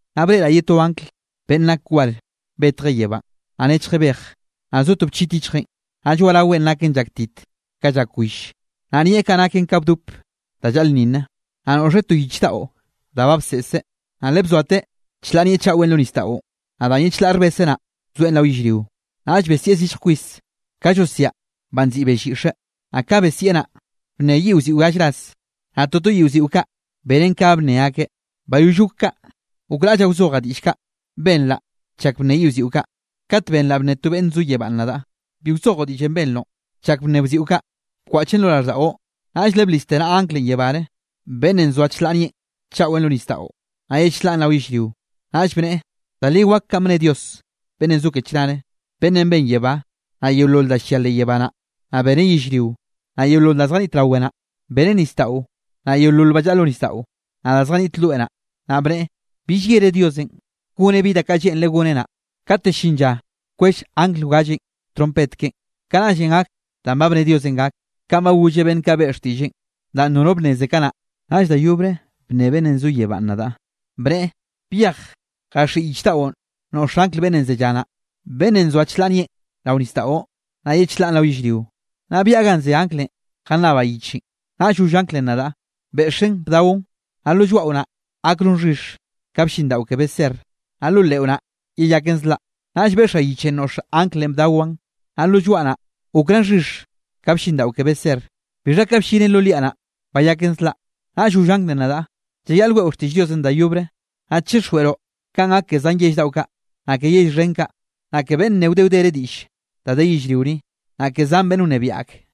Naꞌ breꞌraꞌ ye to angl beꞌnn nak war betjeꞌ yebánꞌ, naꞌ nechje bej, naꞌ zo to bchit yichjeꞌn, naꞌ lloaꞌraweꞌn naken llaktit ka llak will, naꞌ nieꞌ kaꞌ naken ka bdop da llaꞌlnninne. Naꞌ noꞌxeꞌ to yich daꞌo da ba bseꞌseꞌ. Naꞌ le bzoate chlaꞌ nieꞌ chaꞌwenꞌ lo nisdaꞌon, naꞌ danꞌ ye chlaꞌ rbese naꞌ, bzoeꞌn rao yellrio. Naꞌll besieꞌ zillj kwis, ka llosiaꞌ banꞌ nziꞌi bell yiꞌxe. Naꞌ ka besieꞌ naꞌ, bnne yiꞌ wziꞌo gall ras, naꞌ toto yiꞌ wziꞌo kaꞌ benen ke ga bnne akeꞌ. Bayoll gok kaꞌ, gokraꞌllaꞌ wzojaꞌ diꞌll kaꞌ benraꞌ chak bnne yiꞌ wziꞌo kaꞌ, kat benraꞌ bne to beꞌnne zo yebánꞌ nadaꞌ: —Bi wzojoꞌ diꞌllenꞌ benroꞌ chak bnne wziꞌo kaꞌ, bkwaꞌchen lo raꞌlldaꞌo. Naꞌll le bliste naꞌa anglenꞌ yebáre, beꞌnnenꞌ nzoa chlaꞌ nieꞌ chaꞌwe lo nisdaꞌon, naꞌ ye chlaꞌn rao yellrio. Naꞌll bneꞌe, da li wak kanꞌ bne Dios beꞌnnenꞌ zo ke chnare, beꞌnnenꞌ ben yebá, naꞌ yeolol da llia leꞌ yebá naꞌ, naꞌ beneꞌ yellrio, naꞌ yeolol da zjaniꞌt rawe naꞌ, beneꞌ nisdaꞌo, naꞌ yeolol ba llaꞌa lo nisdaꞌo, naꞌ da zjaniꞌt loe naꞌ. Naꞌ bneꞌe: —Bill llere Diosenꞌ goneꞌ bi da kaꞌ lleꞌnreꞌ goneꞌ naꞌ. Kate llin lla wkwell angl wgallenꞌ trompet keꞌen, kanaꞌllenꞌ gak danꞌ ba bne Diosenꞌ gak, kanꞌ ba golleꞌ beꞌnn kaꞌ beꞌe xtiꞌlleꞌn, danꞌ nono bnneze kanaꞌ. Naꞌll da yobre bnne beꞌnnenꞌ zo yebánꞌ nadaꞌ, bneꞌe: —Byej jaxhiꞌi yich daꞌon noꞌx angl beꞌnnenꞌ zellá naꞌ, beꞌnnenꞌ nzoa chlaꞌ nieꞌn rao nisdaꞌon, naꞌ ye chlaꞌn rao yellrio. Naꞌll byaꞌa ganꞌ ze anglenꞌ jannabaꞌ yichenꞌ. Naꞌll goll anglenꞌ nadaꞌ: —Beꞌxen bdaon. Naꞌ lo lloaꞌo naꞌ, gakroꞌn xhix ka blliꞌndaꞌo ke beser, naꞌ lo leꞌo naꞌ, yeyaken zlaꞌ. Naꞌll beꞌxaꞌ yichenꞌ noꞌx anglenꞌ bdawaꞌn. Naꞌ lo lloaꞌ naꞌ, gokraꞌn xhix ka blliꞌndaꞌo ke beser, bixha ka bllinen lo liaꞌ naꞌ, bayaken zlaꞌ. Naꞌll goll anglenꞌ nadaꞌ: —Llayaꞌl weꞌo xtiꞌll Diosenꞌ da yobre, naꞌ chixjweꞌroꞌ kanꞌ gak ke zan yell daꞌo kaꞌ, naꞌ ke yell xhen kaꞌ, naꞌ ke beꞌnn nne wde wdere diꞌll da de yellrio ni, naꞌ ke zan beꞌnn wnebiaꞌ ak.